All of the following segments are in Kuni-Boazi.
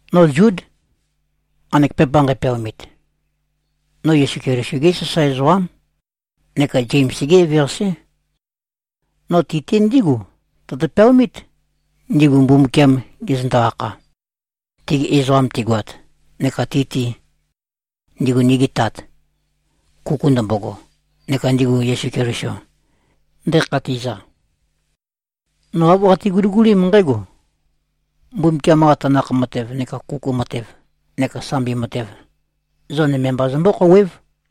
No Zúd, nqanek pepa nqæpeaomit. No Yesu Keliso-gé sasae ezoqám neka Zems-gé eveqasé. No ti-te ndígu tøtø-peaomít, ndigu Mbumbukiam gezøndo-akha, tegi ezoqam tigoat, neka ti-te, ndego nigi Tat, kuku ndømbogo, neka ndigu Yesu Keliso ndekhatiza. No āv qate-guligulím nqǽgo: Mbumbukiam-qa tanakh matev neka kuku matev neka sambi matev, zo nøme mba zømbó-khouwév.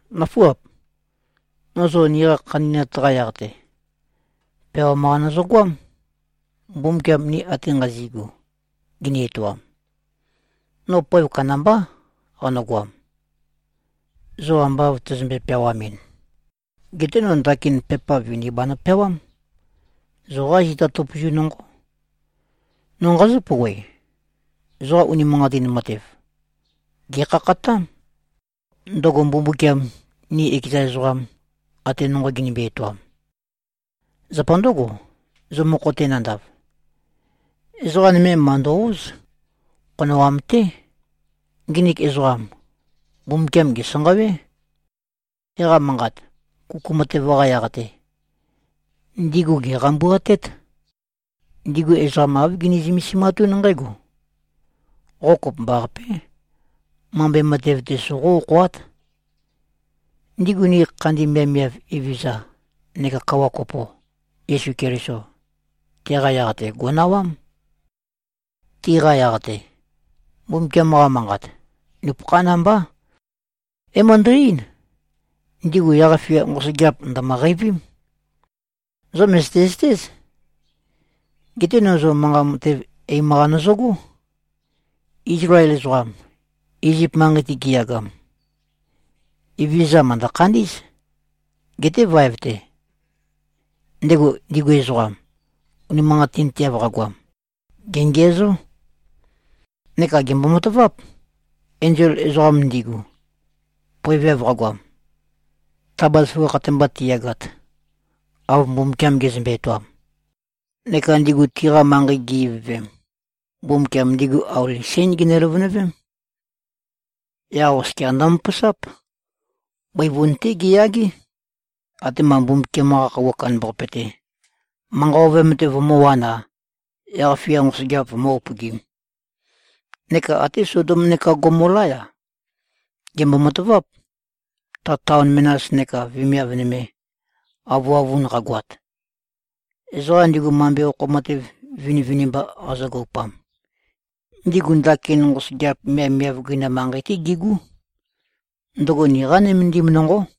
Nǿfuap! No zo niqa khandi꞉nat-qa yaq-te, peawam-qa nøzøgoám, Mbumbukiam ni ate nqazi꞉gu gini-etoam. No poev kandambá qanøgoam, zo amba av tæzømbe-peawamin. Geté no ndakin pepa vini banø-peawám. Zoqá zita tøpøzu nonqó. No nqazǿ-pouwe: Zoqa unimanqatin matev, gèkhakhatám, ndøgo Mbumbukiam ni ekeza ezoqam, ate nonqo ginimbi-etoam. Zapa ndǿgo, zo mokho-te nandav, ezoqa nøme màndo-óz. Khonoam-té. Nginik ezoqam, Mbumbukiam gèsanqawé. Teqa Manqat, kuku matev-qa yaq-te, ndigu gèqambuatét. Ndigu ezoqa āv gini-zømesimatún nqǽgo: Qo kopømbaqapé, mambe matev-te soqó-okhoát. Ndigu nigi khandi miavmiav Evezøza neka Kawa kopo, Yesu Keliso, teqa yaq-te gò꞉nawám. Tiqa yaq-te, Mbumbukiam-qa Manqat, nupøkhán mbá, é-møndæ-eín, ndigu yaq-fia nqosøgeap ndø̀mø-qeivím. Zo mø̀zøte-zøtéz. Geté no zo manqa matev eim-qa nøzøgó. Izlael ezoqam, Izip manqei-te giyagam, Evezøza mø̀ndø-khandí꞉z. Geté vaev-te, ndego ndigu ezoqam, unimanqatinteav qagoam, gèngiæzó. Neka gèmbo-mataváp. Enzol ezoqam ndigu, poeveav qagoam, ta bazaføgakh-te mba tiyagat, av Mbumbukiam gezømbe-etoam, neka ndigu tiqa manqei gi-ivøvem, Mbumbukiam ndigu auli sén gene-løvønøvém. Yaq oskia ndømøpøsáp. Bøivun-té giyagé, atema Mbumbukiam-qa Khøuwa Kandambaqape-te, manqa ovøyam-te vømǿwān-a, yaq-fia nqosøgeap vǿ-upøgīm. Neka até Sodom neka Gomolá-ya, gèmbo-mataváp. Ta taon menas neka vemiav nøme, avøavun qagoat, ezoqam ndigu mambe okho matev vinivinimba qazøgoupam, ndigu ndakin nqosøgeap miavmiav gøinam manqei-té gigú. Ndøgo niqá nømendim nonqó.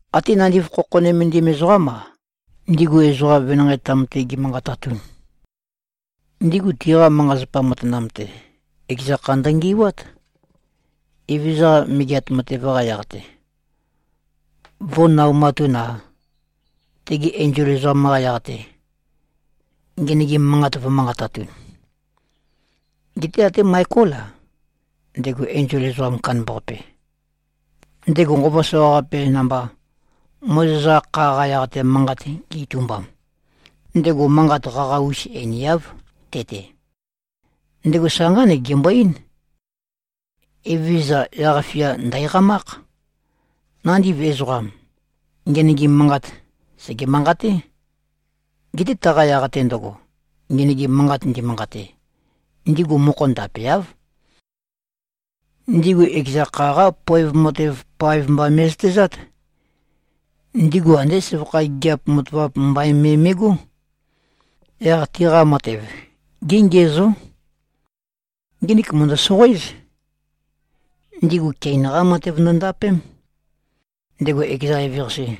Até nandiv khokho nømendim ezoqám-a, ndigu ezoqa venanqei-tam-te gi꞉manqatatun, ndigu tiqa manqa-zapa matanam-te, ekeza kha ndøngi꞉wát, Evezøza-qa megeat matev-qa yaq-te vō꞉naumatun-a, tegi enzol ezoqam-qa yaq-te, ngenøgim manqat vø̄manqatatun. Geté até Maekól-a, ndego enzol ezoqam kandambaqape, ndego nqova soqaqape namba Mozes-qa kha-qa yaq-te manqat ge-itumbam, ndego manqat qaqa-us einiáv, te-te. Ndego sa nqánek gembo-eín, “Evezøza, yaq-fia ndæ̀qamákh.” Nandiv ezoqam, ngenøgim manqat, sège-manqaté. Geté taqa yaq-te ndøgo, ngenøgim manqat ndi꞉manqate, ndigu mokho ndapeáv. Ndigu ekeza kha-qá poev matev paev mba me꞉zøtezát. Ndigu andé søvakha gigiap matavap mbain me me꞉gó. Yaq tiqa matev géngiæzó. Nginik mø̀ndø-soqoéz. Ndigu Kein-qá matev ndøndapém, ndego ekeza eveqase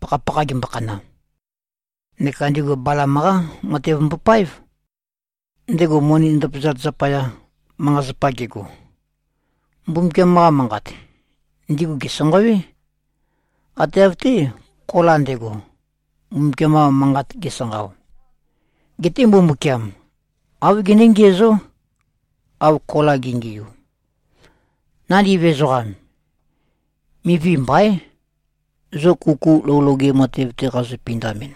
pakhapakha gembokhana. Neka ndigu Balam-qá matev mbopáev, ndego moni ndøpazat zapaya, manqa-zapa gego. Mbumbukiam-qa manqat, ndigu gèsanqawé, ate av-té, Kola nde꞉go, Mbumbukiam-qa manqat gesanqao. Geté Mbumbukiam, āv gené-ngiæzó, av Kola ge꞉ngiu. Nandiv ezoqam, mivi mbaín. Zo kuku lou loge matev-te qazo-pindamɨn,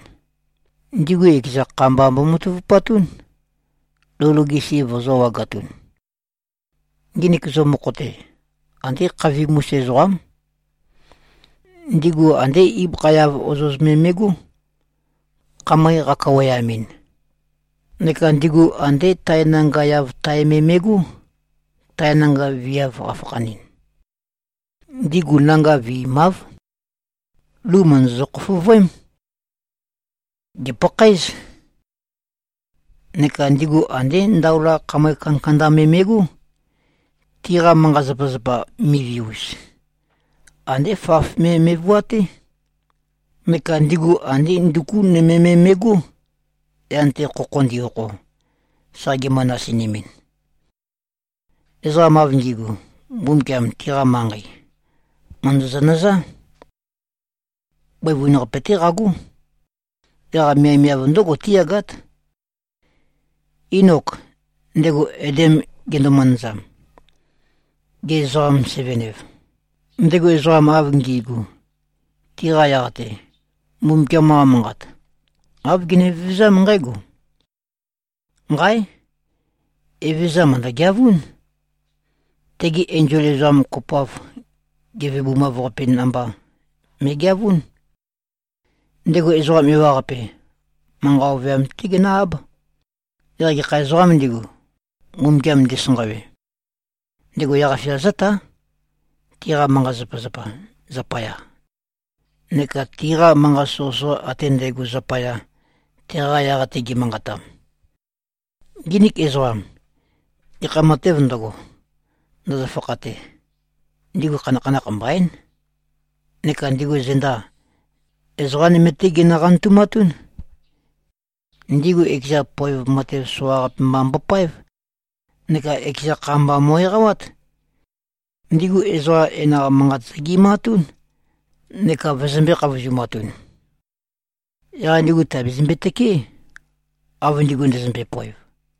ndigu ekeza kha mba mbomatavupatún, lou loge si vøzø̄-wagatun. Nginik zo mokho-te, andé khavim-us ezoqám. Ndigu andé ibøkha-yav ozoz me me꞉gó, khamøe qakaweamɨn. Neka ndigu andé tae nanga-yav tae me me꞉gó. Tae nanga viav qafakhanɨn, ndigu nanga vi꞉māv. Lu mø̀ndøzø-khofovøém. Gèpakhaéz. Neka ndigu andé ndaola khamøe kandakanda me me꞉gó. Tiqa manqa-zapazapa mivi-us, andé faf me me꞉vuaté. Neka ndigu andé nduku nøme me me꞉gó, yan-te khokho ndi-okho, sa gimø-nasinimɨn. Ezoqam av ngi꞉gu, Mbumbukiam tiqa manqei, mø̀ndøzø-nøzá. Bøivun-qape-té qagó. Yaq miavmiav ndǿgo tíyagát. Inok, ndego Adam gendo-manazam, ge-ezoqam-seven-ev, ndego ezoqa av ngi꞉gu, tiqa yaq-te, Mbumbukiam-qa manqat, āv gene-vevezám nqǽgo, “Nqáe! Evezøza mø̀ndø-geavún. Tegi enzol ezoqam kopoav gevebumav-qape namba me꞉geavún. Ndego ezoqa ewaqape manqa ovøyam-té genǿ-áb. Yaq gekha ezoqām ndigu, Mbumbukiam ndisanqawe, ndego yaq-fia zǿtá, tiqa manqa-zapazapa zapaya neka tiqa manqat soqøsoqa ate ndægo zapaya, teqa yaq-te gi꞉manqatam.” Nginik ezoqam, gekha matēv ndøgo, ndøzø-fakhate, ndigu khanakhanakh mbaín. Neka ndigu zenda, ezoqa nøme-té ginø-qantumatún. Ndigu ekeza poev matev soqaqape mba mbopáev, neka ekeza kha mba mo꞉-eqawát. Ndigu ezoqa enaq manqat zøge꞉matún neka vøzømbē-khavozumatun. Yaq ndigu tìabezømbe-tøkeé, av ndigu ndøzømbe-poev.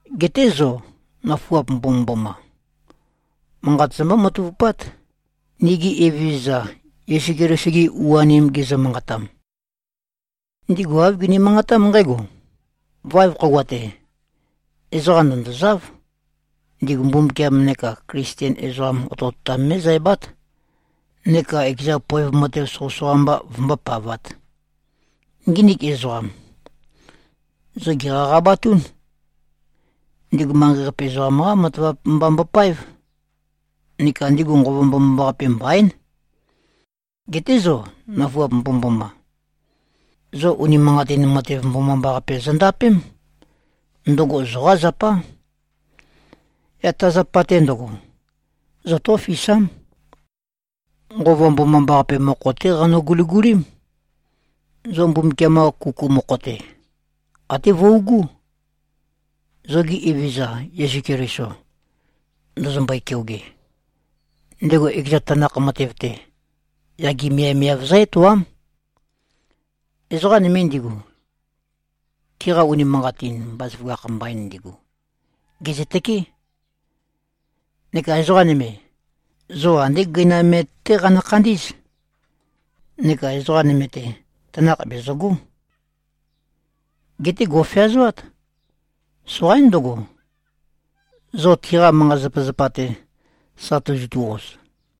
Geté zo, nøfuap mbomømboma, manqat zombó-matavupát, nigi Evezøza Yesu Keliso-gi u-anim gizø-manqatam. Ndigu āv gini-manqatám nqǽgo, “Vaev khøuwa-te, ezoqa ndø̀ndozáv. Ndigu Mbumbukiam neka Klisten ezoqam otøotam mé꞉zæbát, neka ekeza poev matev soqøsoqa mba vømbópavāt.” Nginik ezoqam, zo gèqaqabatún. Ndigu manqei-qape ezoqam-qá matavap mba mbopáev. Neka ndigu Nqova Mbomambaqape mbaín. Geté zo, nøfuap mbomømboma! Zo unimanqatin matev mbomambaqape zondapém. Ndøgo zoqá zapá. Yaq ta zapa-te ndøgo, zotófisám. Nqova Mbomambaqape mokho-té qanø-guligulím. Zo Mbumbukiam-qa kuku mokho-te, até vøugú, zo nigi Evezøza Yesu Keliso ndøzømbøe-keoge. Ndego ekeza tanakh matev-te, yage miavmiav zǿ-etoám. Ezoqa nøme ndigu, tiqa unimanqatin bazaføgakh mbain ndigu, gèzøtøkeé. Neka ezoqa nøme, zo andé gøinam-me-té qanø-khandí꞉z. Neka ezoqa nøme-te, tanakh bezøgó. Geté go꞉feazoát. Soqaín ndøgo, zo tiqa manqa-zapazapa-te, sa tozotu-oz.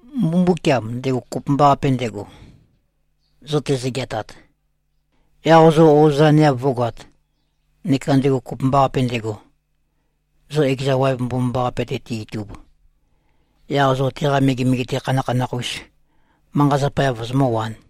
Mbumbukiam, ndego kopømbaqape ndego, zo tezø-geatat, yaq zo o꞉zaneav vǿgoāt, neka ndego kopømbaqape ndego, zo ekeza waev mbomambaqape-te te-itub, yaq zo teqa megemege-te khanakhanakh-us manqa-zapa-yav vozomǿwān,